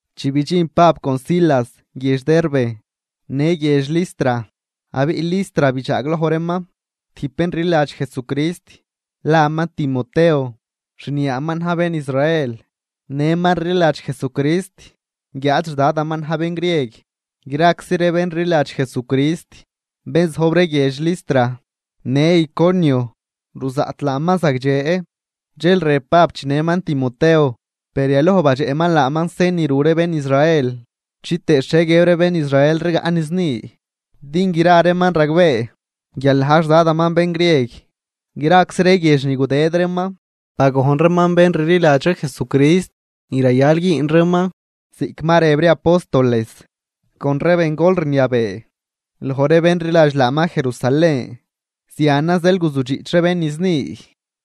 Chi bidxin Pab con Silas guiedx Derbe në guiedx Listra abiꞌ Listra bidxaagloj reeman tijb bén rliladx Jesucrist, laman Timoteo, xniaaman na̱j bén Israel, nëman rliladx Jesucrist guiáad xdadaman na̱j bén grieg. Graczi ree bén rliladx Jesucrist, bén zojb ree guiedx Listra në Iconio ruzaꞌt laaman zagdxe. Dxel rëb Pab chinëman Timoteo, per yaloj badxeꞌman laaman sen ni ru ree bén Israel, chitëë xhie guiëb ree bén Israel rigaꞌ niz ni, din gra reeman ragbee guial na̱j xDadaman bén grieg. Graczi ree guiedx ni gudëd reeman bagojn reeman bén rliladx ree Jesucrist ni rayal güün reeman ziꞌc ma rëb ree apóstoles, con ree bengol rniabee loj ree bén rliladx laaman Jerusalén. Zianan zeel guzudxiꞌch ree bén niz ni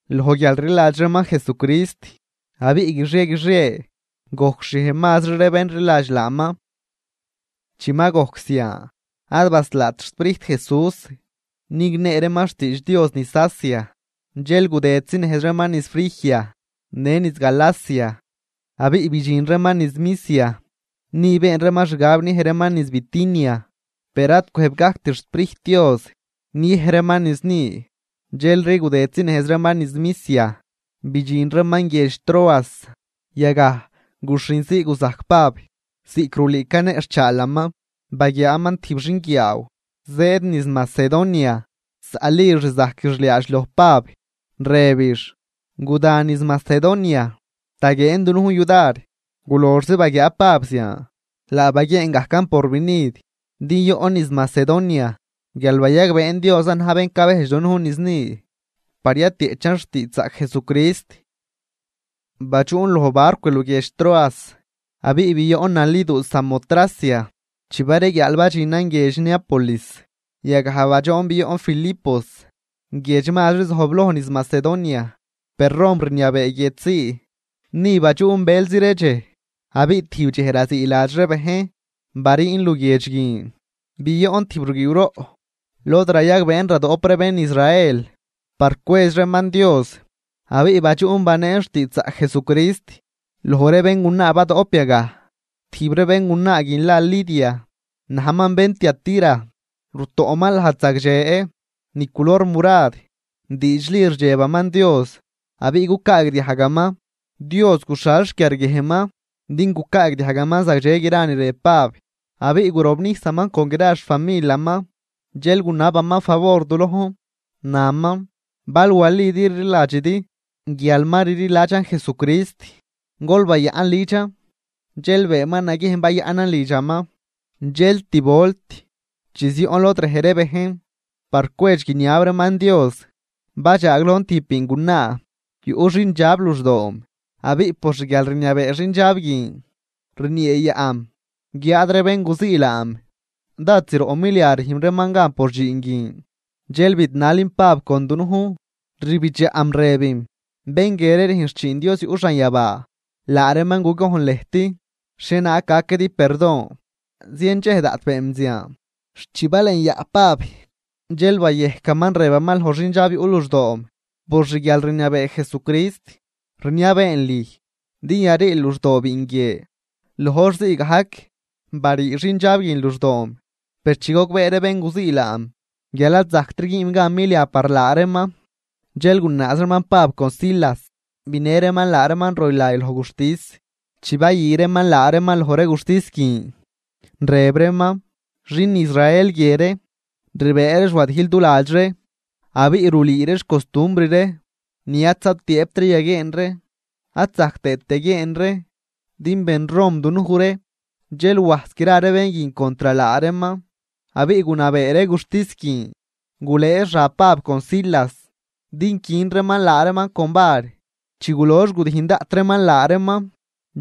loj guialrliladx reeman Jesucrist, abiꞌ guixie guixie gojcxhiej mazri ree bén rliladx laaman. Chi ma gojc zian ad baslaat xSprijt Jesús nignee reeman xtiidx Dios niz Asia. Dxel gudëdzinejz reeman niz Frigia në niz Galacia abiꞌ bidxin reeman niz Misia. Ni been reeman xgab niej reeman niz Bitinia, per ad cwëjb gajct xSprijt Dios niej reeman niz ni. Dxelri gudëdzinejz reeman niz Misia, bidxin reeman guiedx Troas. Yagaj, guxhinzii guzajc Pab ziꞌc rulüü caneꞌxhchaalaman. Baguiaaman tijb xinguiaaw zëëd niz Macedonia, zaꞌlix rzajquix liaadx loj Pab, rëbix: ―Guda niz Macedonia, taguieen dunujn yudar. Guloxzi baguiaa Pab zian, laa baguieen gajcan porvinid din yoꞌn niz Macedonia guial bayagbeen Diosan na̱j bén cabejdx dunujn niz ni par yatieꞌchan xtiidxzaꞌc Jesucrist. Badxuꞌn loj barcw luguiedx Troas abiꞌ bioꞌn naliduu Samotracia. Chi bareguiaal badxinan guiedx Neápolis. Yagaj badxoon bioꞌn Filipos, guiedx mazri zojbloj niz Macedonia, per Rom rniabee guiedx zii, ni badxuꞌn bëlzi ree dxej. Abiꞌ tijb dxej raziiladx ree bejn, bariin luguiedx guin bioꞌn tijb ruguiiwroꞌ, lod rayagbeen radoꞌp ree bén Israel par cwedx reeman Dios. Abiꞌ badxuꞌn baneen xtiidxzaꞌc Jesucrist loj ree béngunaa badoꞌp yagaj. Tijb ree béngunaa guin la Lidia, najman bén Tiatira, rutoꞌman lajd zagdxe ni culor murad. Diidxli rdxebaman Dios abiꞌ cucaagdiajgaman. Dios guxhal xquiarguiejnman din gucaagdiajgaman zagdxe gra ni rëb Pab. Abiꞌ gurobnijsaman con gra xfamilaman. Dxel gunabaman favor du lojn, naman: ―Bal walidi rliladxidi guial ma rliladxan Jesucrist, gol bayaꞌn lidxan. Dxel beenman naguiejn bayaꞌnan lidxaman. Dxel tib volt, chi zioꞌn lod rej ree bejn par cwedx guiniab reeman Dios, badxaaglojn tijb biingunaa, yuꞌ xindxab luxdoom, abiꞌ por xguialrniabee xindxab guin rnieeyaꞌm guiáad ree bén guzii laam dád zroꞌ milia rüjn reeman gan por dxiin guin. Dxel bidnalim Pab con dunujn, rbidxaꞌm rëbim: ―Bén guie ree rüjn xchiin Dios yuꞌ xanyabaa, laa reeman gugojn lëjt xhienaag gaquidi perdon. Zien dxej daꞌt beenm zian, xt chi balenyaꞌ Pab, dxel bayejcaman rëbaman loj xindxab yuꞌ luxdoom: ―Por xguialrniabee Jesucrist, rniabeen lüj din yariil luxdoo biin guie. Loj hor zii gajc barii xindxab guin luxdoom. Per chi gogbee ree bén guzii laam guial ad zajctri güünm gan milia par laa reeman, dxel gunaaz reeman Pab con Silas, binë reeman laa reeman roylay loj guxtis. Chi bayü reeman laa reeman loj ree guxtis guin, rëb reeman: ―Xin Israel guie ree rbëë reex wadijl du ladx ree, abiꞌ rulüü reex costumbr ree ni ad zatiëëbt ree yaguieen ree ad zajc tëët yaguieen ree, din ben Rom dunuj ree. Dxel wajs gra ree bén guin contr laa reeman, abiꞌ gunabee ree guxtis guin gulëë xab Pab con Silas din quin reeman laa reeman con var. Chi gulox gudijn daꞌt reeman laa reeman,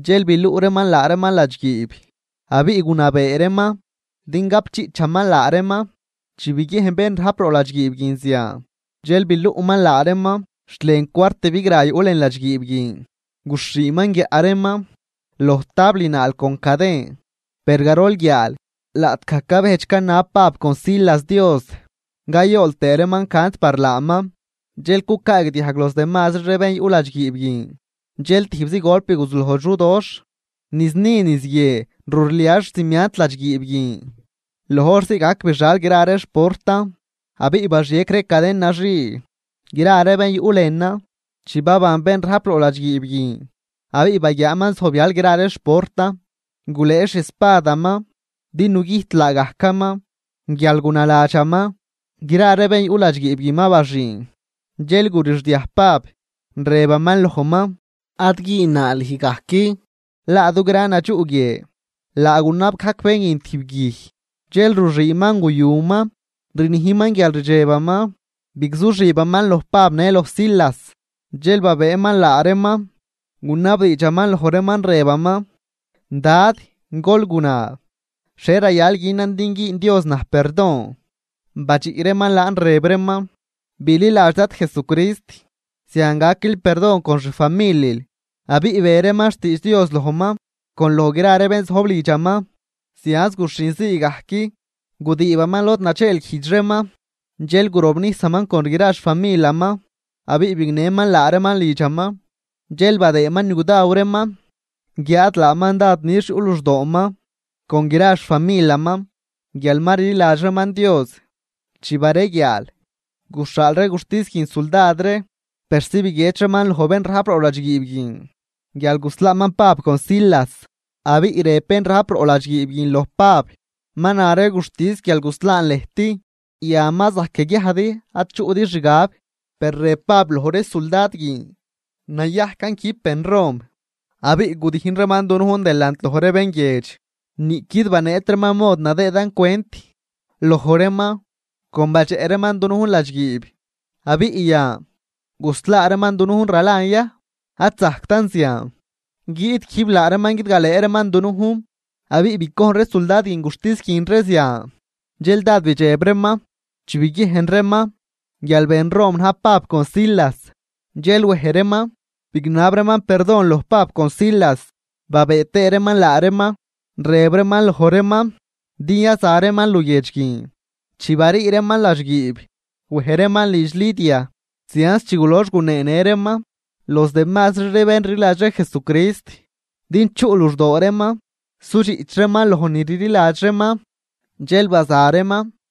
dxel biluꞌ reeman laa reeman ladxguiib abiꞌ gunabee reeman bén rajp roꞌ ladxguiib guin din gapdxiꞌchaman laa reeman. Chi biguiejn bén rajp roꞌ ladxguiib guin zian, dxel biluꞌman laa reeman xt lën cuart bigra yuꞌ lën ladxguiib guin, guxhiiman guiaꞌ reeman loj tabl naal con caden. Per garol guiaal, laꞌtgaj cabejdx canab Pab con Silas Dios, cayool tëë reeman cant par laaman, dxel cucaagdiajg los demazri ree bén yuꞌ ladxguiib guin. Dxel tijbzi golp guzuloj xudoxh, niz ni niz guie rurlia xcimiant ladxguiib guin. Loj hor zii gajc bixal gra ree xportan abiꞌ baxiec ree caden naxii gra ree bén yuꞌ lënan. Chi baban bén rajp roꞌ ladxguiib guin abiꞌ baguiaaman zojbyal gra ree xportan, gulëë xi espadaman din nugüjt laagajcaman guial gunaladxaman gra ree bén yuꞌ ladxguiib guin ma baxüün. Dxel gurixdiaj Pab, rëbaman lojman: ―Ad güünnaa lüj gajc, laa dugran nadxuꞌ guie. Laa gunab gajc bén guin tijb guij, dxel ruxüünman guyuman, rnijman guial rdxebaman, bigzuxibaman loj Pab në loj Silas. Dxel babëëman laa reeman, gunabdiidxaman loj reeman, rëbaman: ―Dad, gol guna, ¿xhie rayal günan din güün Dios naj perdon? Badxiꞌ reeman laan, rëb reeman: ―Bililadx Dad Jesucrist, zian gaquil perdon con xfamilil. Abiꞌ be reeman xtiidx Dios lojman con loj gra ree bén zojb lidxaman. Zianz guxhin zii gajc gudiibaman lod nadxeelguijdx reeman, dxel gurobnijsaman con gra xfamilaman. Abiꞌ bignëman laa reeman lidxaman, dxel badëëman ni gudaw reeman. Guiáad laaman dád nix yuꞌ luxdooman con gra xfamilaman Guial ma rliladx reeman Dios. Chi bareguiaal, guxhaal ree guxtis guin suldad ree persi biguiedx reeman loj bén rajp roꞌ ladxguiib guin guial guslaaman Pab con Silas. Abiꞌ rëb bén rajp roꞌ ladxguiib guin loj Pab: ―Ma na ree guxtis guial guslaan lëjt. Yan ma zajc yaguiajdi ad chuꞌdi xgab. Per rëb Pab loj ree suldad guin: ―Nayajcan quijb ben Rom abiꞌ gudijn reeman dunujn delant loj ree bén guiedx, niꞌquid baneet reeman mod nadëëdan cwent loj reeman con badxeꞌ reeman dunujn ladxguiib. Abiꞌ yan, ¿guslaa reeman dunujn ralan ya? ¡Ad zajctan zian! Guiꞌt quijb laa reeman guidgalëë reeman dunujn. Abiꞌ bicojn ree suldad guin guxtis guin ree zian, dxel dád bidxeb reeman chi biguiejn reeman guial ben Rom na̱j Pab con Silas. Dxel wej reeman bignab reeman perdon loj Pab con Silas babëë tëë reeman laa reeman, rëb reeman loj reeman din yaza reeman luguiedx guin. Chi barii reeman ladxguiib, wej reeman lidx Lidia. Zianz chi gulox guneenë reeman los demazri ree bén rliladx ree Jesucrist din chuꞌ luxdoo reeman sudxiꞌch reeman loj ni rliladx reeman, dxel baza reeman.